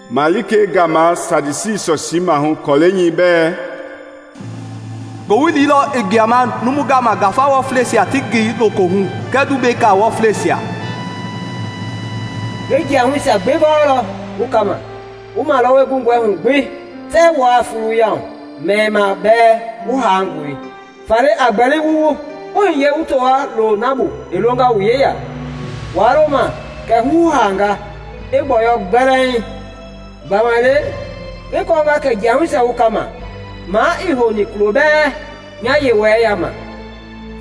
“Malikei gama Saadisi sɔsii maahu kɔlɛi nyɛi bɛ: “Ngowili lɔ i gbuama numui gama ngafa wɔfleisia ti ngi lokohu kɛɛ tumbeka wɔfleisia. Ngi jiahuisia gbi gɔɔlɔ wu kama; wu malɔwɔi gungɔi hugbi tɛɛ wua fuluyahu, meimaa bɛɛ wu haangɔe! Faale a gbɛli wu wuu wu hiye wu towa loo na bu i longa wu yeya, waa loma kɛ huhaanga i gbɔyɔi gbɛlɛɛŋ. Gbamaile ngi kɔɔnga kɛ jiahusia wu kama ma ii hou kulo bɛɛ nya Yewɔɛi yama.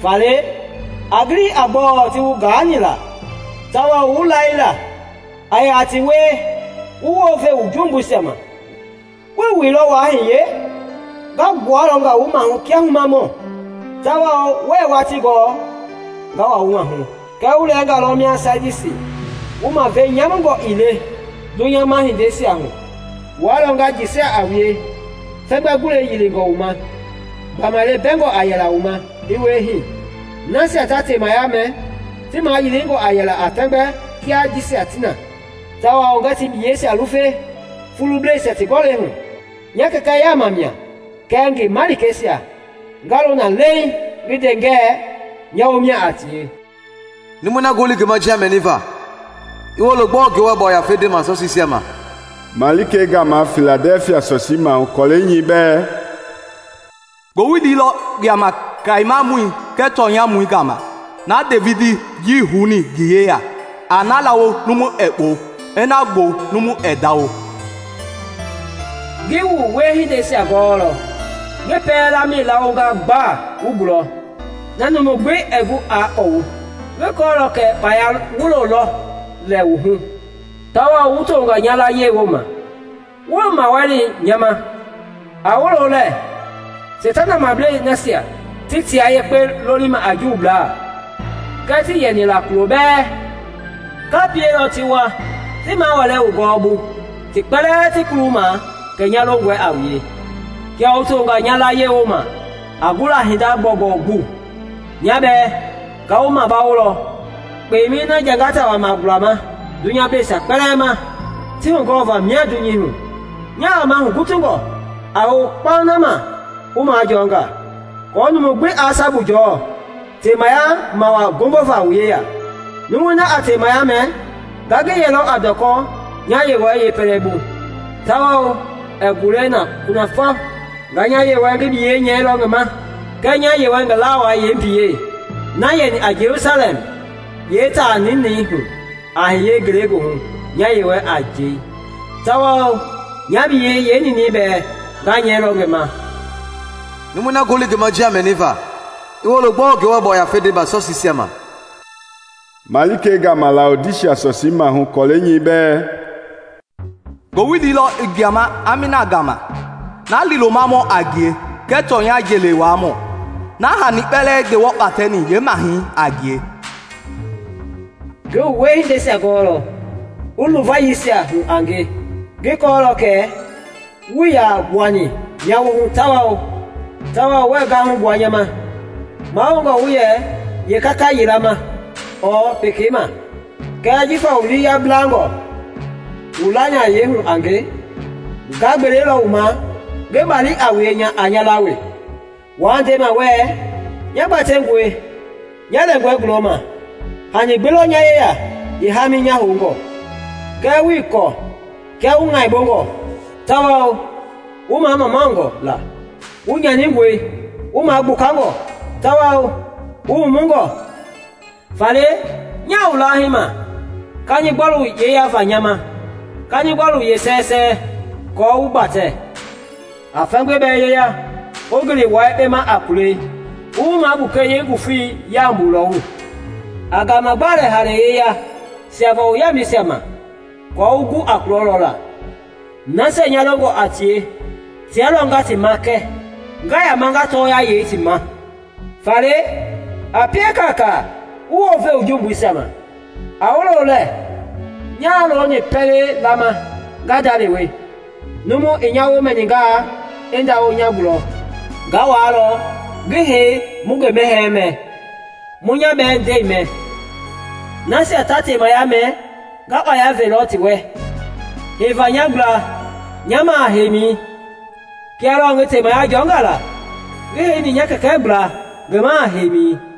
Faale, a gili a gbɔɔ ti wu gaani la tawao wu laila; a yaa ti wie wu wounve wu jumbuisia ma. Wuii wuilɔ wua hiye, nga gbualɔnga wu maahu kia humamɔ, tawao wuɛɛ watii gɔɔ nga wa wu mahu. Kɛɛ wu lɛnga lɔ mia Saadisi wu mavei nyamungɔ ii le dunyama hindeisia hu. Wua lɔ nga jɛsia a wue, fɛmgbɛ gulei yilingɔ wu ma, gbamaile bɛngɔ a yɛla wu ma i wie hii. Nasia ta temaya mɛ ti mayilingɔ a yɛla a fɛmgbei kia jisia ti na, tawao ngɛɛ ti biyeisia lufe fulubleisia ti gɔlɛi hu. Nya Kɛkɛ yaama mia kɛɛ ngi malikeisia nga loona leiŋ ngi nde ngɛ nya womia a tie. “Numui na ngoli ngi ma njia mɛniva, i woolo gbɔɔ Ngewɔ Yafei ndema sɔsiisia ma!” “Malikei gama Filadɛfia sɔsii maahu kɔlɛi nyɛi bɛ: Ngowili lɔ gbuama kayemamɔi kɛɛ tɔnyamɔi gama, na Devidi jii houni ngi yeya, a na laawo numu ɛɛ kpɔu, i na gbɔwu numu ɛɛ ndawo. Ngi wu wiehindeisia gɔɔlɔ. Ngi dui laawonga gba wu gulɔ, na numu gbi ɛɛ gu aa kpɔwu. Ngi kɔɔlɔ kɛ kpaya wulo lɔ lɛ wu hu, tawao wu tonga nya layie woma wuii mawali nya ma. A woolo lɛ! Seitana mablei nasia ti tia yekpe lolima a Juublaa, kɛɛ tii yɛnila kulo bɛɛ, nga pielɔ ti wa ti maawɛlɛ wu gɔɔbu ti kpɛlɛɛ ti kuluma kɛ nya longɔi a wue. Kia wu tonga nya layie woma a gula hinda gbɔugbɔu bu, nya bɛɛ nga wu mabawolɔ kpemɛi na jangata wama gulama dunyableisia kpɛlɛɛ ma ti hugɔva mia dunyei hu. Nyaa wama hugutungɔ. A hou kpauŋ na ma wu majɔɔnga, aako numu gbi aa sabu jɔɔ temaya mawaa ngombo va wu yeya. Numui na a temaya mɛ nga ngi yɛlɔ a ndɔkɔ nya Yewɔɛi yepɛlɛbu, tawao ɛɛ gulɛi na kunafɔ. Nga nya Yewɔɛi ngi biyɛi nyɛilɔ ngi ma kɛɛ nya Yewɔɛi ngi lawai yeembiyei, na yɛni a Jelusalɛm yeetaa ninɛihu a hiye ngelegoohu nya Yewɔɛi a jei. Tawao nya biyɛi yeeninɛi bɛɛ nga nyɛilɔ ngi ma. “Numui na ngoli ngi ma njia mɛniva, i woolo gbɔɔ Ngewɔ Yafei ndema sɔsiisia ma!” Malikei gama Laodisia sɔsii maahu kɔlɛi nyɛi bɛ: “Ngowili lɔ i gbuama Amiina gama, na liilomamɔ a ngie kɛɛ tɔnya jeli wuaamɔ, na hani kpɛlɛɛ Ngewɔ kpatɛni yeemahɛi a ngie. Ngi wu wiehindeisia gɔɔlɔ. Wu luvayiisia hu a nge, ngi kɔɔlɔ kɛ wuii yaa gbuani nya woohu tawao wuɛɛ gahu gbua nya ma. Mahoungɔ wu yɛ yeekakayila ma ɔɔ pekei ma! Kɛɛ jifa wu lii yablangɔ wu lanayei hu a nge, nga gbelelɔ wu ma ngi bali a wue a nya laa we! Wua ndema wɛ, ‘Nya gbatɛngɔe nya lɛngɔ gulɔma, hani gbi lɔ nya yeya yeehami nya houngɔ.’ Kɛɛ wuii kɔɔ kia wu ŋaibongɔ tawao wu mamaungɔ la! Wu nyaningɔe, wu magbukangɔ, tawao wu wumungɔ. Faale nyaa wu lahii ma kanigbɔlu yeyava nya ma, kanigbɔlu yeesɛsɛɛ, aako wu gbatɛ. A fɛmgbei bɛɛ yeya wu gili wua yekpe ma a kulɛi wu wu magbuke yeengufei yambu lɔwu. A gaama gbalɛ hale yeya siava wu yaamɛisia ma, aako wu gu a kulɔ lɔ la. Nasia nya longɔ a tie tia lɔ nga ti makɛ nga yama nga tɔɔya yei ti ma. Faale, a pie kaaka wu wounve wu jumbuisia ma. A woolo lɛ! Nyaa looni pɛlei laama nga ndalewe, numu i nya wo mɛningaa i ndawo nya gulɔ, nga wuaalɔ ngi hei mu ngi mɛhɛɛ mɛ, mu nya bɛɛ nde mɛ. Nasia ta temaya mɛ nga kpaya velɔ ti wɛ heiva nya gbla nya maha heimi, kia lɔɔ ngi temaya jɔnga la ngi heini nya kɛkɛ gbla ngi maha heimi.